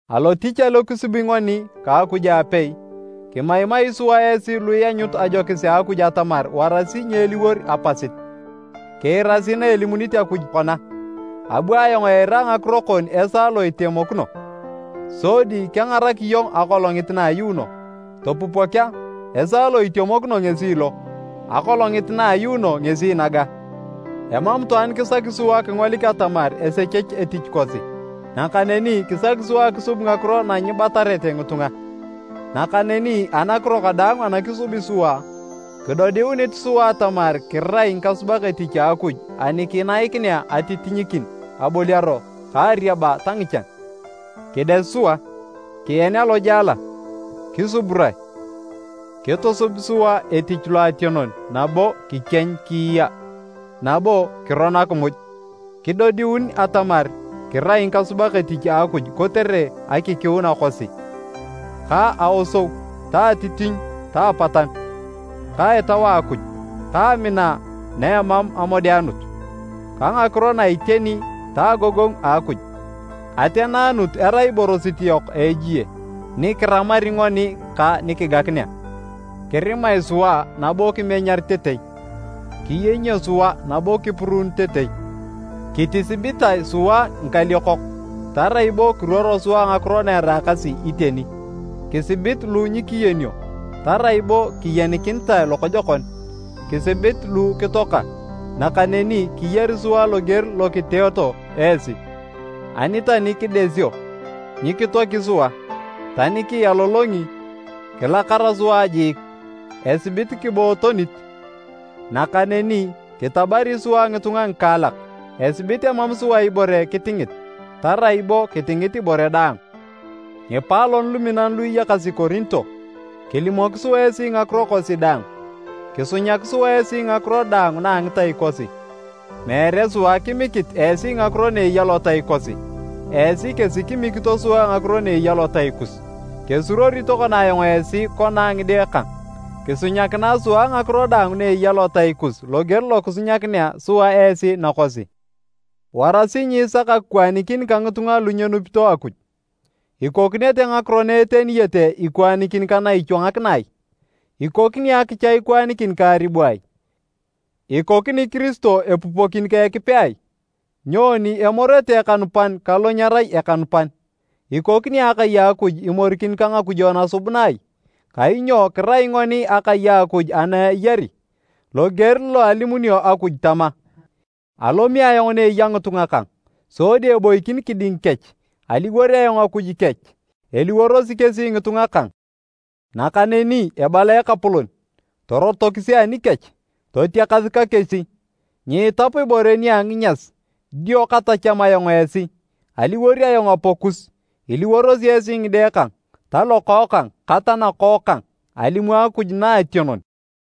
Alotich alo kisubi ngoni ka Akuj aapei, kimaimai sua esi lu ianyut ajokis a Akuj atamar warasi nyeliwor apasit. Kiirasi na elimunit Akuj kona, “Abu ayong eira ngakiro kon esaa lo itemokino, sodi kengarak iyong akolongit na a ayuuno.” Topupok a! Esaa lo itemokino ngesi lo, akolongit na ayuuno ngesi naga! Emam itwaan kisaki sua kingolik atamar esechech etich kosi. Nakaneni kisaki sua akisub ngakiro na nyibatarete ngitunga. Nakaneni anakiro kadaang ana kisubi sua, kidodiunit sua atamar kirai ngikasubak etich a Akuj ani kinaikinea atitinyikin aboliaro ka ariaba ta ngichan. Kides sua, kien alojala, kisuburae, kitusub sua etich loationon nabo kikieny kiiya, nabo kiron akimuj. Kidodiun atamar kirai ngikasubak etich a Akuj kotere akikiuna kosi, ka aosou ka atitinyikin ta apatanu, ka Etau a Akuj, ka amina na emam amodeanut, ka ngakiro na a iteni ta agogongu a Akuj. Ateneanut erai iborosit yok a ejie, ni kiramari ngoni ka nikigakinea. Kirimae sua nabo kimenyaritetei, kiyenyio sua nabo kipuruunitetei. Kitisibitae sua ngikaliokok, tarai bo kiruoro sua ngakiro na eraakasi iteni, kisibit lu nyikiyenio, tarai bo kiyenikinitae lokojokon, kisibit lu kitoaka, nakaneni kiyari sua loger lo kiteeto esi. Ani tani kidesio, nyikitoaki sua. Tani kialolongi, kilakara sua jiik, esibit kibootonit, nakaneni kitabari sua ngitunga ngikaalak, esibit emam sua ibore kitingit, tarai bo kitingit ibore daang. Ngipaalon luminan lu iyakasi Korinto! Kilimok sua esi ngakiro kosi daang, kisunyak sua esi ngakiro daang na a ngitai kosi. Meere sua kimikit esi ngakiro na eya lotai kosi, esi kesi kimikito sua ngakiro na eya lotai kus. Kesuruori tokona ayong esi kona a ngide kang: kisunyakinae sua ngakiro daang na eya lotai kus loger lo kisunyakinea sua esi nakosi! Warasi nyiisak akikwaanikin ka ngitunga lu nyenupito Akuj. Ikokinete ngakiro na eteniyete ikwaanikin ka na ichwangakina ai? Ikokini akicha ikwaanikin ka aribu ai? Ikokini Kiristo epupokin ka Ekipe ai? Nyoni emorete ekanupan ka lo nyerai ekanupan? Ikokini Akai a Akuj imorikin ka ngakujo nasubuna ai? Kainyo kirai ngoni akai Akuj ana eyari! Loger lo alimunio Akuj tama, “Alomi ayong ni eya ngitunga kang sodi eboikin kiding kech, aliwor ayong Akuj kech, eliworosi kesi ngitunga kang.” Nakaneni ebala Ekapolon, “Torotokisi anikech, totiakas ka kesi, nyiitap ibore nia nginyas, dio katacham ayong esi. Aliwor ayong Apakus, iliworosi esi ngide kang, talokookang ka tanakookang, alimu Akuj Naationon.”